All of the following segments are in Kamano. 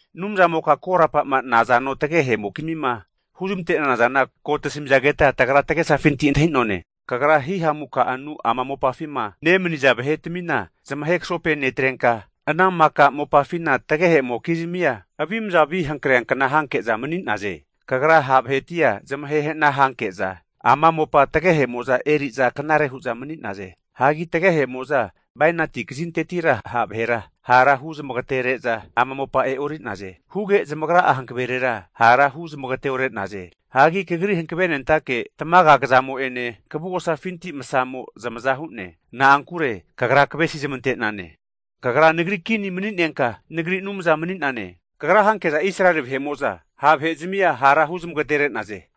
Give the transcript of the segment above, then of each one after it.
Anumzamoka korapa'ma nazano tagehe'mokizmima huzmante'nana zana ko tasamizageta tagra tagesafinti antahi'none. Kagra hihamu ka'anu ama mopafima nemaniza vahetmina zamahe kasope netrenka, ana maka mopafina tagehemokizmia avimazavi hankreankna hanke'za mani'naze. Kagra ha' vahetia zamahe hana hanke'za ama mopa tagehe'moza eri'za knare hu'za mani'naze. Hagi tagehemo'za bainati kazintetira ha' vahera harahu zamagatere'za ama mopa e'ori'naze. Huge zamagra'a hankaverera hara hu zamagateore'naze. Hanki Kagri hankavenentake tamaga kazamo'ene kavugosafinti masamo zamaza hu'ne. Na'ankure Kagra kavesizmante'nane. Kagra nagri kini mani'nenka, nagri Anumzana mani'nane. Kagra hanke'za Israeli vahe'mo'za ha' vahe'zmia hara huzmagatere'naze.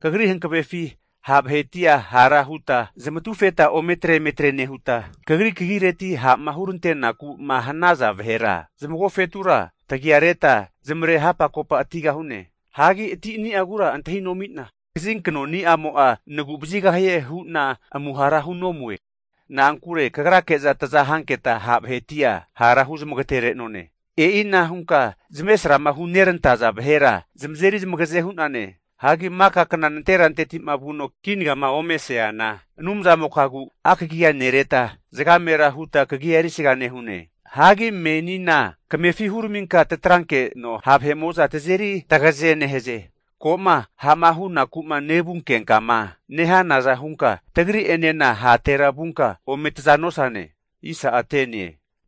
Kagri hankavefi ha' vahetia hara huta zamatufeta ometre emetre nehuta, Kagri kagireti ha'ma hurantenaku'ma hanaza vahera zamagofetura tagia reta zmare hapakopatigahune. Hagi atini'agura antahinomi'na, kazinknoni'amo'a nagu'vazigahie hu'na amuhara hunomue. Na'ankure Kagrake'za taza hanketa, ha' vahetia hara huzmagaterenone. E'ina hunka zamavaresrama hunerantaza vahera zamazeri zamagaze hu'nane. Hagi maka kna nanterantetima vuno kinagama omeseana Anumzamokagu akagia nereta, zagamera huta kagia erisga nehune. Hagi menina kamefi huraminka tatrankeno ha' vahe'mo'za tazeri tagaze nehaze. Ko'ma ha'ma hunaku'ma nevunkenkama nehanaza hunka tagri'enena hatera vunka ome taza nosane.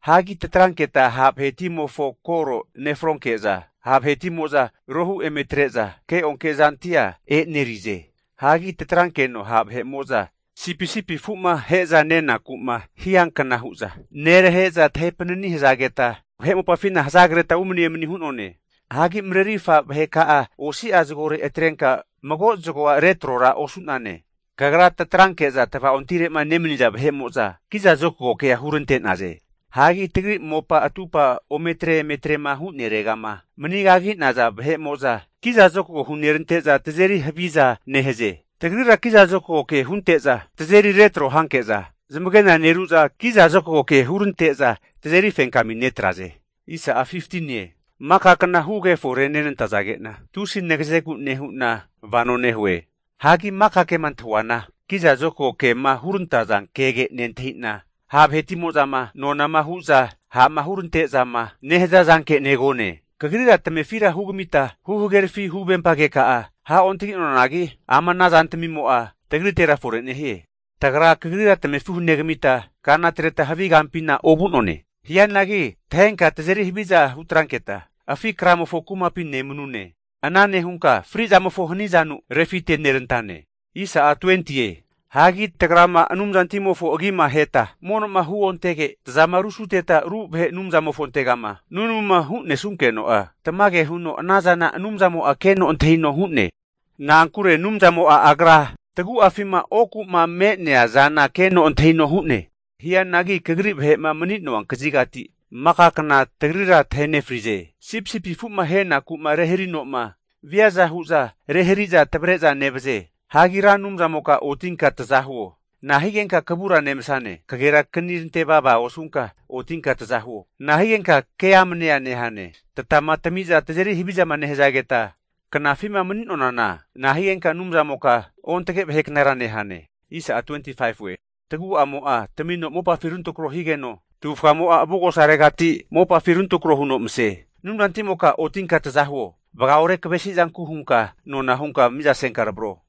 Hagi tatranketa ha' vahetimofo koro nefronke'za, ha' vahetimo'za rohu eme tre'za keonke'zantia e'nerize. Hagi tatrankeno ha' vahe'mo'za sipisipi afu'ma ahe'za nenaku'ma hiankna hu'za nerahe'za tahe panani hazageta vahe mopafina hazagreta umani emani hu'none. Hagi marerifa vaheka'a osi'a zagore atrenka mago zagoa retrora osu'nane. Kagra tatranke'za tava'ontire'ma nemaniza vahe'mo'za kiza zokago kea hurante'naze. Hagi tagri mopa atupa ometre emetrema hu'neregama manigagi'naza vahe'mo'za kizazokago ke hunerante'za tazeri haviza nehaze. Tagrira kizazokago ke hunteza tazeri retro hanke'za, zamagena neru'za kizazokago hurante'za tazeri fenkami netraze. Maka kna hugeforenenantazage'na, tusi nagazegu nehu'na vano nehue. Hagi maka kema antahunana kizazokago kema hurantaza kege nentahita, ha' vahetimo'zama nonama hu'za ha'ma hurante'zama nehaza zanke negone. Kagrira tamefira hugamita huhagerafi huvempa keka'a ha'ontaginonanagi, ama ana zantamimo'a tagritera fore nehie. Tagra Kagrira tamefira hunegamita kana atreta havi kampina ovu'none. Hianagi tahenka tazeri haviza hutranketa afi kramofo kumapi nemanune. Ana nehunka frizamofo hanizanu refitenerantane. Hagi tagrama Anumzantimofo agima aheta mono'ma huontege, tazama rusuteta ru vahe' anumzamofontegama nunamuma hunesunkeno'a, tamage huno anazana Anumzamo'a keno antahino hu'ne, na'ankure Anumzamo'a Agra tagu'afima oku'ma me'nea zana keno antahino hu'ne. Hianagi Kagri vahe'ma mani'nona kazigati maka kna tagrira tahe nefrize. Sipisipi afu'ma ahenaku'ma reharino'ma viaza hu'za rehari'za tavre'za nevaze Hagi Ra Anumzamoka otinka taza huo! Nahigenka kavura nevasane? Kagera kanirante vava osunka otinka tazahuo. Nahigenka ke'amnea nehane? Tatama tami'za tazeri havizama nehazageta knafima mani'nonana nahigenka Anumzamoka ontage vahe knara nehane? Tagu'amo'a tamino mopafi runtrako higeno, tavufgamo'a avugosaregati mopafi runtrako huno mase. Anumzantimoka otinka taza huo! Vagaore kavesizanku hunka nona hunka mizasenka tavro.